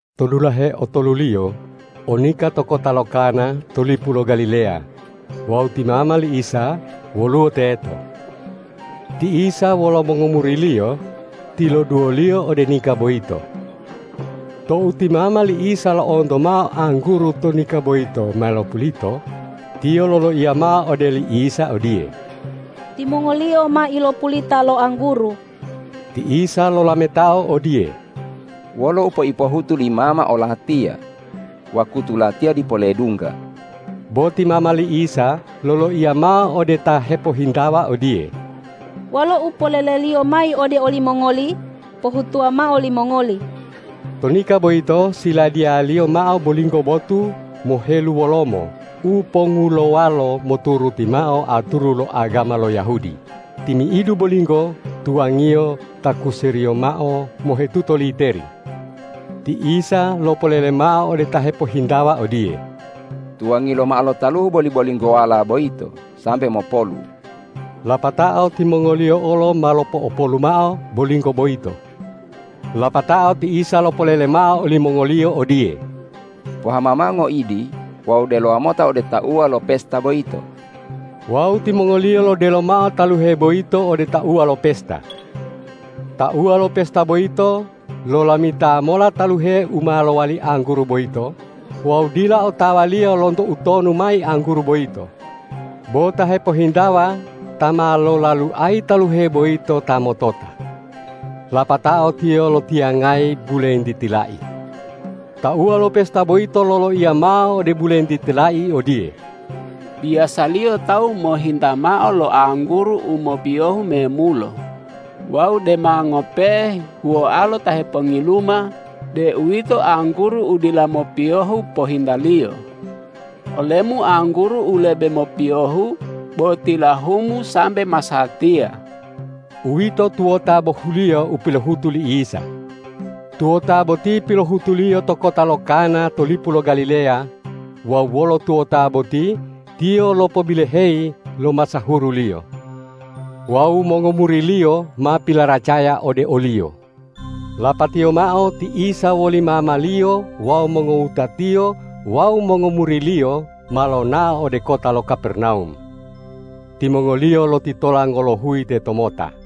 To dulahe otoluliyo o nika to kota lo Kana to lipu lo Galileya wawu ti mama li Isa woluwo teto. Ti Isa wolo mongomuri-Liyo tiloduwoliyo ode nika boyito. Tou ti mama li Isa lo'onto mao angguru to nika boyito ma lopulito, tiyo loloiya mao ode li Isa odiye,”Timongoliyo ma ilopulita lo angguru.” Ti Isa lolametao odiye,”Wolo u peipohutu li mama o-Latiya? Wakutu Latiya dipo ledungga.” Bo ti mama li Isa loloiya mao ode ta hepohintawa odiye,”Wolo u polele-Liyo mayi ode olimongoli, pohutuwa mao limongoli!” To nika boyito siladiyaliyo mao bolinggo botu moheluwolomo u pongulowalo moturuti mao aturu lo agama lo Yahudi, timi'idu bolinggo tuwangiyo takuseriyo mao mohetuto literi. Ti Isa lopolele mao ode ta hepohintawa odiye,”Tuwangi lomao lo taluhu boli-bolinggowala boyito sambe mopolu.” Lapatao timongoliyo olo ma lopo'opolu mao bolinggo boyito. Lapatao ti Isa lopolele mao olimongoliyo odiye,”Pohama mao ngoidi wawu delowa mota ode tauwa lo pesta boyito.” Wawu timongoliyo lodelo mao taluhe boyito ode tauwa lo pesta. Tauwa lo pesta boyito lolamita mola taluhe u ma lowali angguru boyito wawu dila otawaliyo lonto utonu mayi angguru boyito, bo ta hepohintawa ta ma lolaluayi taluhe boyito ta motota. Lapatao tiyo lotiyangayi bulentiti lai. Tauwa lo pesta boyito loloiya mao ode bulentiti lai odiye,”Biyasaliyo tawu mohinta mao lo angguru u mopiyohu memulo wawu dema ngope'e huwoalo ta hepongiluma, deuwito angguru u dila mopiyohu pohintaliyo; olemu angguru u lebe mopiyohu bo tilahumu sambe masatiya.” Uwito tuwota bohuliyo u pilohutu li Isa. Tuwota boti pilohutu-Liyo to kota lo Kana to lipu lo Galileya wawu wolo tuwota boti Tiyo lopobiloheyi lo masahuru-Liyo. Wawu mongomuri-Liyo ma pilaracaya ode o-Liyo. Lapatiyo mao ti Isa woli mama-Liyo wawu mongowuta-Tiyo wawu mongomuri-Liyo ma lonao ode kota lo Kapernawum. Timongoliyo lotitola ngolohuyi tetomota.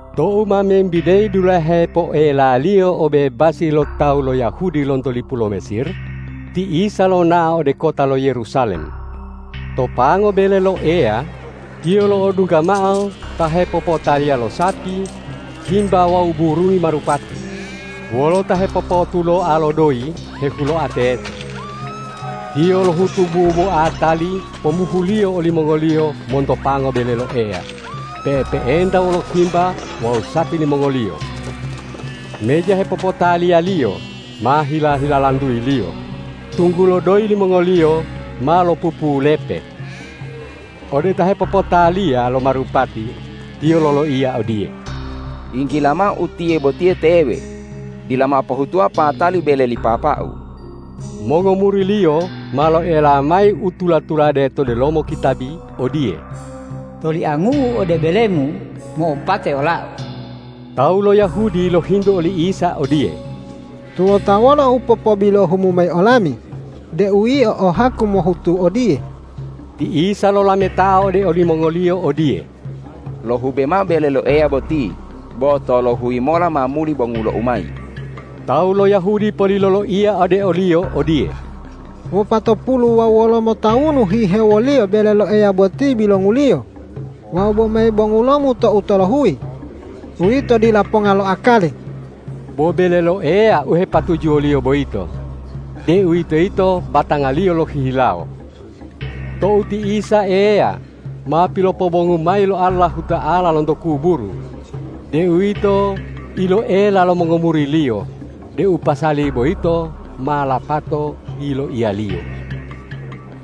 Tou ma membideyi dulahe poelaliyo obebasi lo tawu lo Yahudi lonto lipu lo Mesir, ti Isa lonao ode kota lo Yerusalem. To pango bele lo Eya Tiyo lo'odungga mao ta hepopotaliya lo sapi, himba wawu burungi marupati, wolo ta hepopotuloa lo doyi hehuloa teto. Tiyo lohutu buboa tali pomuhuliyo olimongoliyo monto pango bele lo Eya pe'epe'enta wolo himba wawu sapi limongoliyo. Meja hepopotaliyaliyo ma hila-hilalantuyi-Liyo, tunggulo doyi limongoliyo ma lopupulepe. Ode ta hepopotaliya lo marupati Tiyo loloiya odiye,”Yinggila mao utiye boti tewe! Dila mao pohutuwa patali bele li Papa-U.” Mongomuri-Liyo ma loela mayi u tula-tulade to delomo kitabi odiye,”Toliangu-U ode bele-Mu mo'opate ola-U.” Tawu lo Yahudi lohintu oli Isa odiye,”Tuwota wolo u popobilohu-Mu mayi olami deu Yio o haku mohutu odiye?” Ti Isa lolametao ode olimongoliyo odiye,”Lohube mao bele lo Eya boti, bo tolohuyi mola ma muli bongulo-U mayi.” Tawu lo Yahudi poli loloiya ode o-Liyo odiye,”Wopatopulu wawu wolomo tawunu hihewoliyo bele lo Eya boti bilonguliyo wawu bome bongulo-Mu tou tolohuyi. Uwito dila ponga lo akali.” Bo bele lo Eya u hepatujuwo-Liyo boyito, deuwitoyito batanga-Liyo lohihilawo. Tou ti Isa Eya ma pilopobongu mayi lo Allahuta'ala lonto kuburu, deuwito iloela lo mongomuri-Liyo deu pasali boyito ma lapato yiloiya-Liyo.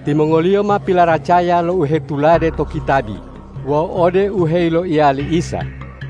Timongoliyo ma pilaracaya lo u hetulade to kitabi wawu ode u heyiloiya li Isa.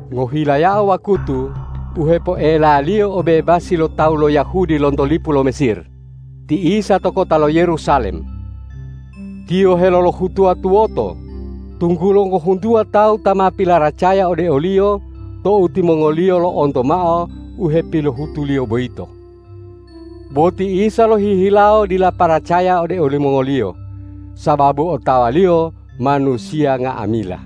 Ngohilayao wakutu u hepoelaliyo obebasi lo tawu lo Yahudi lonto lipu lo Mesir, ti Isa to kota lo Yerusalem. Tiyo helolohutuwa tuwoto, tunggulo ngohuntuwa tawu ta ma pilaracaya ode o-Liyo tou timongoliyo lo'onto mao u hepilohutu-Liyo boyito. Bo ti Isa lohihilawo dila paracaya ode olimongoliyo, sababu otawa-Liyo manusiya nga'amila.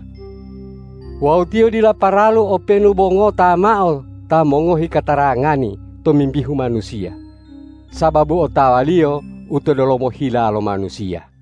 Wawu Tiyo dila paralu openu bo ngota mao ta mongohi katarangani tomimbihu manusiya, sababu otawa-Liyo u to delomo hila lo manusiya.